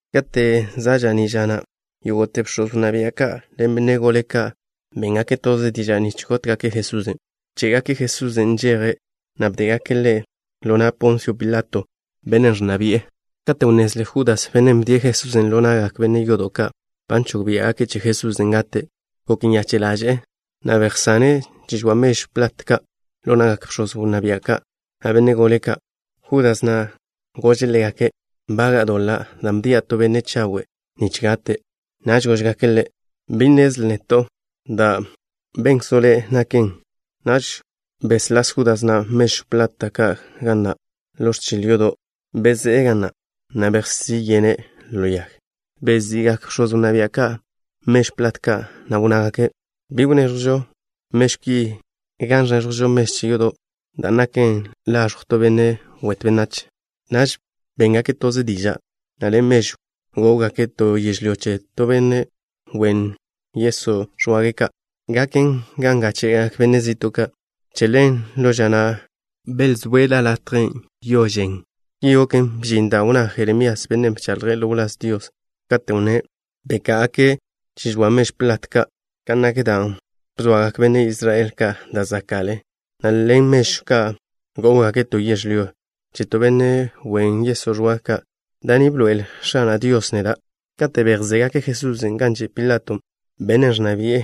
Kate' za' ža'ní' ža na', yógo'te bx̱oz wnná bia' ka' ḻen benne' gole ka', béngake' toze diža' nich gótgake' Jesusen'. Bché'gake' Jesusen' nžeje', na' bdégake' Ḻe' ḻo na' Ponsio Pilato, bennen' ẕnna bi'e. Kate' wnnezle Judas, bennen' bdie' Jesusen' ḻo na'gak benne' yodo' ka', ba nžog che Jesusen' gate', gok nyache' ḻaže'e, na' bejwé'e chi žoa mežw plat ka' ḻo na'gak bx̱oz wnná bia' ka', na' benne' gole ka'. Judas na' gože' ḻégake': —Nbaga'a doḻa' dan' bdia' to benne' chawe' nich gate'. Naž góžgake' Ḻe': —Bi žonen ga gek zédleto' neto'. Da' benkzo' le' naken. Naž wžó'n Judas na' mežw plat ka' gan nak ḻo ẕchil yodo'. Bezé'e ga na', na' bejsí yene' ḻo yag. Bezi'gak bx̱oz wnná bia' ka' mežw plat ka', na' wnnágake': —Bi gonn ko'žo mežw ki gan ẕko'žo mežw che yodo', dan' naken laẕjw to benne' wet benách ka'. Naž béngake' toze diža', na' ḻen mežwn' gó'wgake' to yežlyó che to benne' wen ye'n nich gaken gan gáche'gak benne' zi'to' ka'. Che ḻen, ḻo ža na' belzóe' la latjen', Yo Žen. Ki goken, bžin dan' wnná Jeremías, bennen' bchaḻje' ḻo wláz Dios, katen' wnné': “Beká'agake' chi žoa mežw plat ka', kan nak dan' bzoagak benne' Israel ka' da' zaka' Ḻe', na' ḻen mežw ka' gó'wgake' to yežlyó che to benne' wen ye'n. Da' ni bḻoe'el X̱ana' Dios neda'.” Kate' bejzégake' Jesusen' gan že' Pilato, bennen' ẕnna bi'e,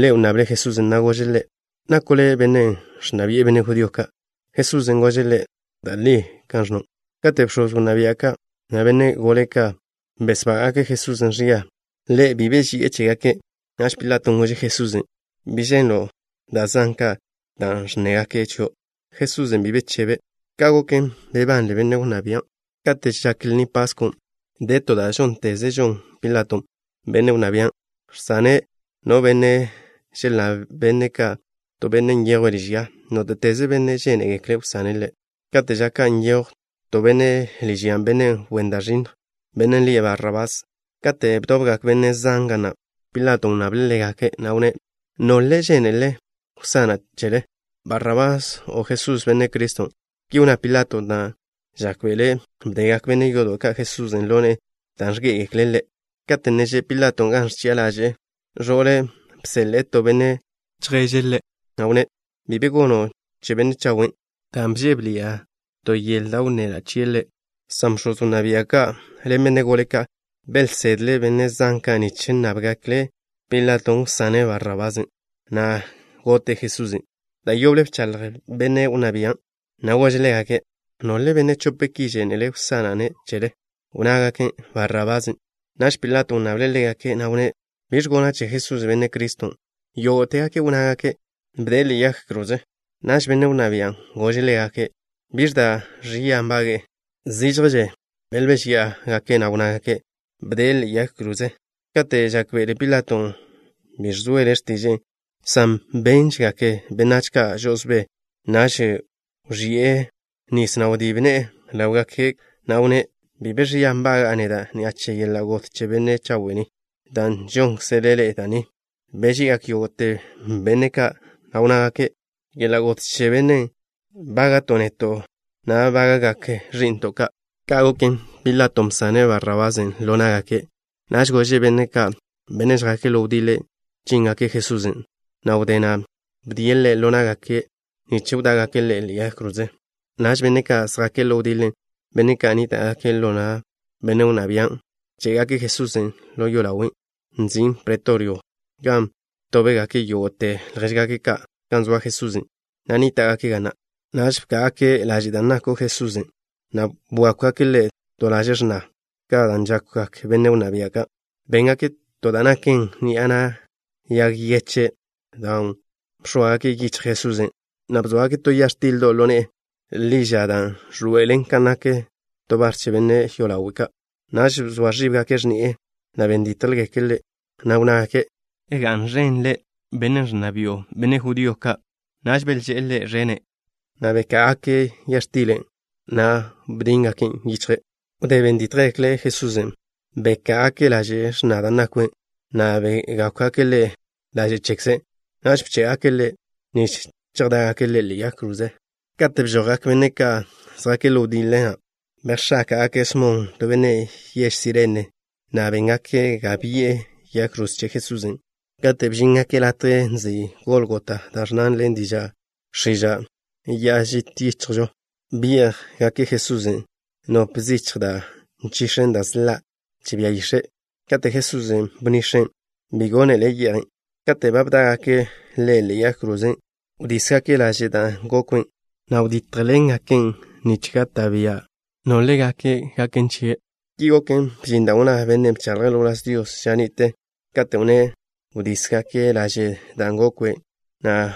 ḻe' wnnable' Jesusen', na' gože' Ḻe': —¿Nako' Le' Benne' Nna Bi'e Benne' Judío Ka'? Jesusen' gože' ḻe': —Da' li ẕnno'. Kate' bx̱oz wnná bia' ka', na' benne' gole ka' besbága'gake' Jesusen' ẕia, Ḻe' bi be beži'e chégake'. Naž Pilaton' gože' Jesusen': —¿Bi ženlo' da' zan ka' da' ẕnnégake' chio'? Jesusen' bi be bechebe'. Ka' goken, bebanle benne' wnná bian'. Kate' žak Lni Paskon', de to da' žónteze žon Pilato, benne' wnná bian', žsane' no benne' želnnáb benne' ka', to benne' nyejwe' liž ya, nóte'teze benne' žénegekle' wsane' ḻe'. Kate' ža ka' nyejw to benne' liž yan', benne' wen da' ẕinnj, bennen' lie' Barrabás. Kate' bdobgak benne' zan ga na', Pilaton' wnnable' ḻégake', na' wnné': —¿Nole' žénelele wsana' chele? ¿Barrabás o Jesús, Benne' Criston'? Ki wnná Pilaton' dan' žákbe'le' bdegak benne' yodo' ka' Jesusen' ḻo ne'e dan' ẕgé'egekle' Ḻe'. Kate' ne že' Pilaton' gan ẕchi'a ḻaže'e, ẕo'le' bseḻe'e to benne' chjape' ḻe', na' wnné': —Bi be gono' che benne' chawen', dan' bžébeḻi'a wdé yele to ḻo bichgale ni'a chie' Ḻe'. San bx̱oz wnná bia' ka' ḻen benne' gole ka', belsedle' benne' zan ka' nich nnábgekle' Pilaton' wsane' Barrabasen', na' gote' Jesusen'. Da' yoble bchaḻj benne' wnná bian', na' gože' ḻégake': —¿Nole' benne' chope ki žénelele wsana'-ne' chele? Wnnágake': —Barrabasen'. Naž Pilaton' wnnable' ḻégake', na' wnné': —¿Biẕ gona' che Jesusen', Benne' Criston'? Yógo'tegake' wnnágake': —Bde'e ḻe'e yag kroze. Naž benne' wnná bian' gože' ḻégake': —¿Biẕ da' ẕia nbage'e? Zížježe belbéžyi'e, na' wnnágake': —Bde'e ḻe'e yag kroze. Kate' žákbe'ele Pilaton' bi ẕzoele x̱tiže'e, san béngakže benách ka' žo'osbé, naž wẕi'e nis, na' wdíb ne'e ḻáwgake', na' wnné': —Bi be ẕia nbaga'a neda' ni'a che yeḻa' got che benne' chawe' ni. Da' žónkzele ḻe'e da' ni. Beži'igak yógo'te benne' ka', na' wnnágake': —Yeḻa' got che bennen' bága'to' neto' na' bága'gak ẕi'nto' ka'. Ka' goken, Pilaton' bsane' Barrabasen' ḻo ná'gake'. Naž gože' benne' ka', benne' žjake' ḻo wdiḻe, chíngake' Jesusen', na' wdé na' bdie' Ḻe' ḻo ná'gake' nich wdá'gake' Ḻe' ḻe'e yag kroze. Naž benne' ka' žjake' ḻo wdiḻe, benne' ka' nníta'gake' ḻo na' benne' wnná bian', bché'gake' Jesusen' ḻo yolawen' nzin' pretorio, gan btóbgake' yógo'te ljéžgake' ka' gan zoa Jesusen', na' nníta'gake' ga na'. Naž bká'agake' laže' da' nakw Jesusen', na' bwákwgake' Ḻe' to laže' x̱na, kan žákwgak benne' wnná bia' ka'. Béngake' to da' naken ni'a na' yag yeche' dan' bx̱óagake' yichj Jesusen', na' bzóagake' to ya x̱tildo' ḻo ne'e ḻi ža dan' ẕḻoe'elen kan nak to bar che benne' yolawe'. Naž bzoa ẕíbgake' x̱ni'e, na' ben dítjgekle' Ḻe', na' wnnágake': —¡Ga'n ẕen Le', benne' ẕnna bi'o benne' judío ka'! Naž belžé'e Ḻe' ẕene', na' beká'agake' ya x̱tilen', na' bdíngaken' yichje'. Wdé ben dítjgekle' Jesusen', beká'agake' laže' x̱na dan' nakwe', na' begákwgake' Ḻe' laže' chekze'. Naž bché'gake' Ḻe' nich chejdá'gake' Ḻe' ḻe'e yag kroze. Katen' bžojgak benne' ka' žjake' ḻo wdiḻe, na' bejx̱áka'gake' Smon, to benne' yež Sirene, na' béngake' ga bi'e yag kroze che Jesusen'. Kate' bžíngake' latjen' nzin' Gólgota, da' ẕnnan ḻen diža' x̱iža', Ya'a Žit Yichjžo, byé'jgake' Jesusen' nop zichj da' nchix̱en da' sḻa' che bia yix̱e'. Kate' Jesusen' bnix̱en', bi gónele' ye'jen'. Kate' ba bdá'gake' Ḻe' ḻe'e yag kroze, wdísgake' laže' da' gokwe', na' btítjgake' ḻawlen nich gak bia' nole' gaken chie'. Ki goken, bžin dan' wnná benne' bchaḻje' ḻo wláz Dios ža ni'te, katen' wnné': “Wdísgake' laže' da' gokwe', na'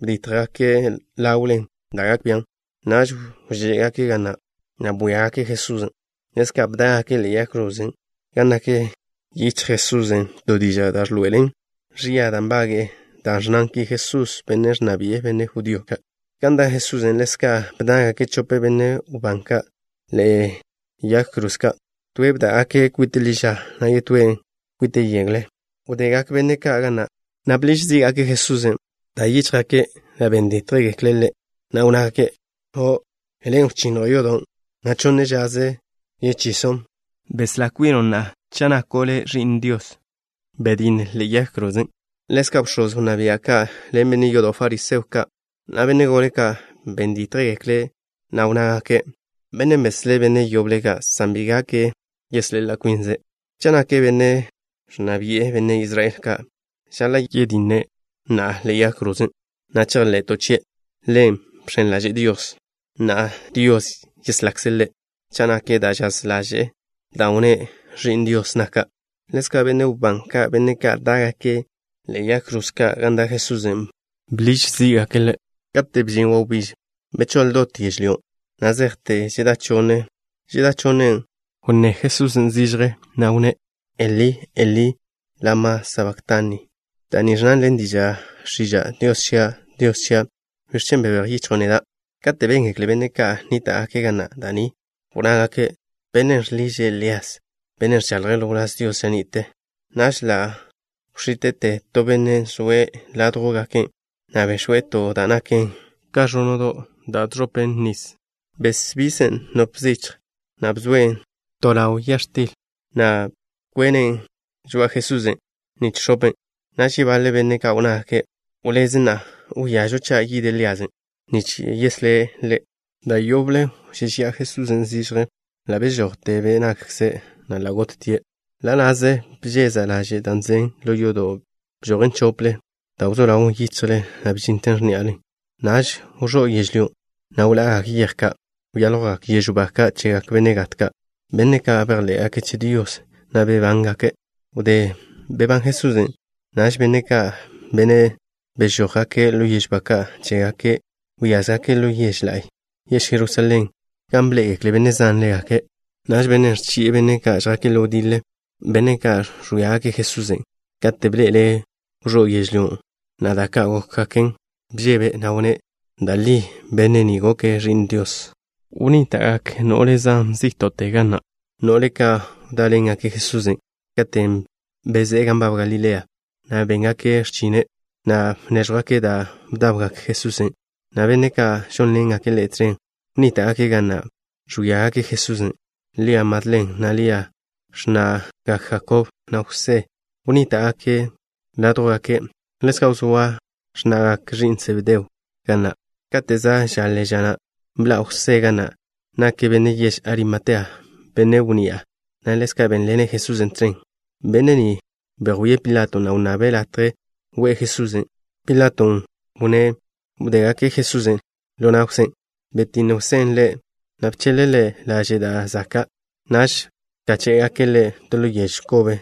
btítjgake' ḻawlen da' gak bian'.” Naž wžé'gake' ga na', na' bwíagake' Jesusen'. Ḻezka' bdá'gake' ḻe'e yag krozen' gan nak yichjle Jesusen' to diža' da' ẕḻoe'elen ẕia da' nbage'e, da' ẕnnan ki: “Jesús, Bennen' Ẕnna Bi'e Benne' Judío Ka'.” Gan da' Jesusen', ḻezka' bdá'gake' chope benne' wbán ka' ḻe'egak yag kroze ka'. Toe' bdá'gake' kwite' ḻi ža, na' yetóen' kwite' yegle. Wdegak benne' ka' ga na', na' bḻiž zí'gake' Jesusen'. Bta yíchjgake', na' ben dítjgekle' Ḻe', na' wnnágake': —O', Le' wchinnjo' yodon', na' chonne žaze ka' yechison'. Beslá kwino' na'a cha' nako' Le' Ẕi'n Dios. Betj na'a ḻe'e yag krozen'. Ḻezka' bx̱oz wnná bia' ka' ḻen benne' yodo' fariseo ka', na' benne' gole ka', ben dítjgekle' Ḻe', na' wnnágake': —Bennen' beslé' benne' yoble ka', san bi gak yeslá kwine'. Cha' nake' Benne' Nna Bi'e Benne' Israel Ka', žaḻa' yetje' na'a ḻe'e yag krozen', na' chejḻe'to' chie'. Ḻe' bx̱en ḻaže'e Dios. Na'a Dios yeslakze' Ḻe' cha' nak da' žaz ḻaže'e, dan' wnné': “Ẕi'n Dios naka'.” Ḻezka' benne' wbán ka', benne' ka' dá'gake' ḻe'egak yag kroze ka' gan da' Jesusen', bḻiž x̱íwe'gake' Ḻe'. Kate' bžin wawbíž, bechóḻ dot yežlyó, na' zejte žedá chonne. Žedá chonnen', wnné zižje Jesusen', na' wnné': —Elí, Elí, ¿lama sabaktani? Da' ni ẕnnan ḻen diža' x̱iža': “Dios chia', Dios chia', ¿biẕ chen' bebéj yichjo' neda'?” Kate' béngekle benne' ka' nníta'gake' ga na' da' ni, wnnágake': —Bennen' žḻiže' Lías, bennen' bchaḻje' ḻo wláz Dios ža ni'te. Naž ḻa' wx̱íte'te to benne' zoe' ládjwgake', na' bex̱we' to da' naken bḻol da' žẕopen nis. Bx̱open' nop zichj, na' bzoen' to ḻawle ya x̱til, na' bchagen' žoa'a Jesusen' nich x̱open'. Naž yebaḻe benne' ka' wnnágake': —Wléz na'a. Wíažo cha' yid Líasen' nich wzetje' Ḻe'. Da' yoble wžéžeya'a zižje Jesusen'. Bžojte be' nakkze', na' ḻa' gottie'. Ḻa' na'ze bžéza'te laže' da' naḻan' ḻo yodo'. Bžojen chople, da' wzó ḻawn yichjlen, na' bžinten x̱ní'alen. Naž wẕó' yežlyó, na' wḻa'gak yej ka'. Wyáljwgak yežw ba ka' chegak benne' gat ka', benne' ka' bejḻé'gake' che Dios, na' bebángake'. Wdé bebán Jesusen', naž benne' ka', benne' bežójgake' ḻo yežw ba ka' chégake', wyázgake' ḻo yež la'y, yež Jerusalén, gan bḻé'egekle benne' zan ḻégake'. Naž bennen' ẕchi'e benne' ka' žjake' ḻo wdiḻe, benne' ka' ẕwíagake' Jesusen', kate' bḻe'ele' wẕó' yežlyó, na' da' ka' gókgaken, bžebe', na' wnné': —Da' li benne' ni goke' Ẕi'n Dios. Wnníta'gak no'le zan zí'to'ze ga na', no'le ka' wdáḻengake' Jesusen' katen' bezé'e gan nbab Galilea, na' béngake' x̱chine', na' bnéẕjwgake' da' bdawgak Jesusen' na' benne' ka' žónḻengake' Ḻe' tẕen. Wnníta'gake' ga na', ẕwíagake' Jesusen'. Lia Madlen na' Lia, x̱na'gak Jakob na' Jwsé, wnníta'gake' ládjwgake'. Ḻezka' wzóa x̱na'gak ẕi'n Sebedeo ka' ga na'. Kate' za' žaḻe ža na', bḻa' Jwsé ga na'. Nake' benne' yež Arimatea, benne' wnni'a, na' ḻezka' bénḻene' Jesusen' tẕen. Benne' ni bejwíe' Pilato, na' wnnabe' latje we'e Jesusen'. Pilaton' wnné' wdégake' Jesusen' ḻo na' Jwsén'. Bzetj Jwsén' Ḻe', na' bcheḻe' Ḻe' laže' da' zaka'. Naž bkáche'gake' Ḻe' to ḻo yežw ba kobe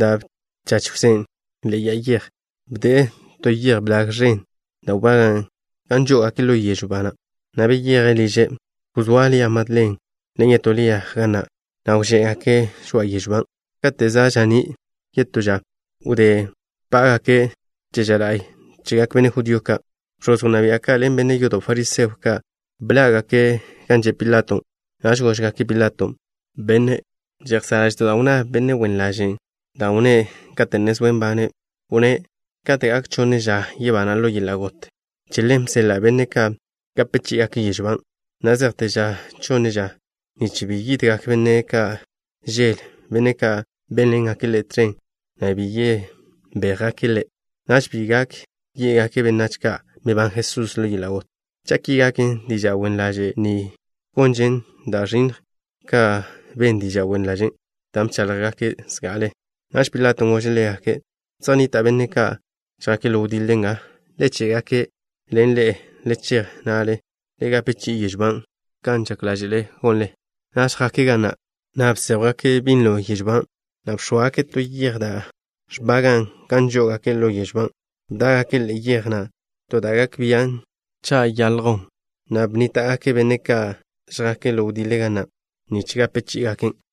da' bchach Jwsén' ḻe'e ya'a yej. Bde'e to yej blag ẕen da' wbagan' gan žó'ogake' ḻo yežw ba na', na' beyeje' liže'. Wzóa Lia Madlen ḻen yetó Lia ga na', na' wžé'gake' žoa'a yežw ban'. Kate' za' ža'ní' yetó ža, wdé bpá'gake' che ža la'y chegak benne' judío ka', bx̱oz wnná bia' ka' ḻen benne' yodo' fariseo ka' bḻá'gake' gan že' Pilato. Naž góžgake' Pilaton': —Benne', žejsá' ḻáže'to' dan' wnná benne' wen ḻažen', dan' wnné' katen' wzóe' nbane'. Wnné': “Kate' gak chonne ža, yebana' ḻo yeḻa' got.” Che ḻen bseḻa' benne' ka' gape chí'igake' yežw ban', na' zejte ža chonne ža, nich bi yidgak benne' ka' žele, benne' ka' bénḻengake' Ḻe' tẕen, na' bi yebéjgake' Ḻe'. Naž bi gak yé'gake' benách ka': “Bebán Jesusen' ḻo yeḻa' got.” Cha' ki gaken, diža' wen ḻaze' ni gonžen da' ẕinnj ka ben diža' wen ḻažen' dan' bcháḻjgake' zga'ale. Naž Pilaton' gože' ḻégake': —Zej nnita' benne' ka' žjake' ḻo wdiḻe nga. Le ché'-gake' ḻen ḻe'e. Le chej, na' le gape chi'i yežw ban' kan sáke'le gonle. Naž jake' ga na', na' bséjwgake' binlo yežw ban', na' bzóagake' to yej da' ẕbagan' gan žó'ogake' lo yežo ban'. Bdá'gake' ḻe'e yej na' to da' gak bian' cha' saljwn, na' bnníta'gake' benne' ka' žjake' ḻo wdiḻe ga na' nich gape chí'igaken'.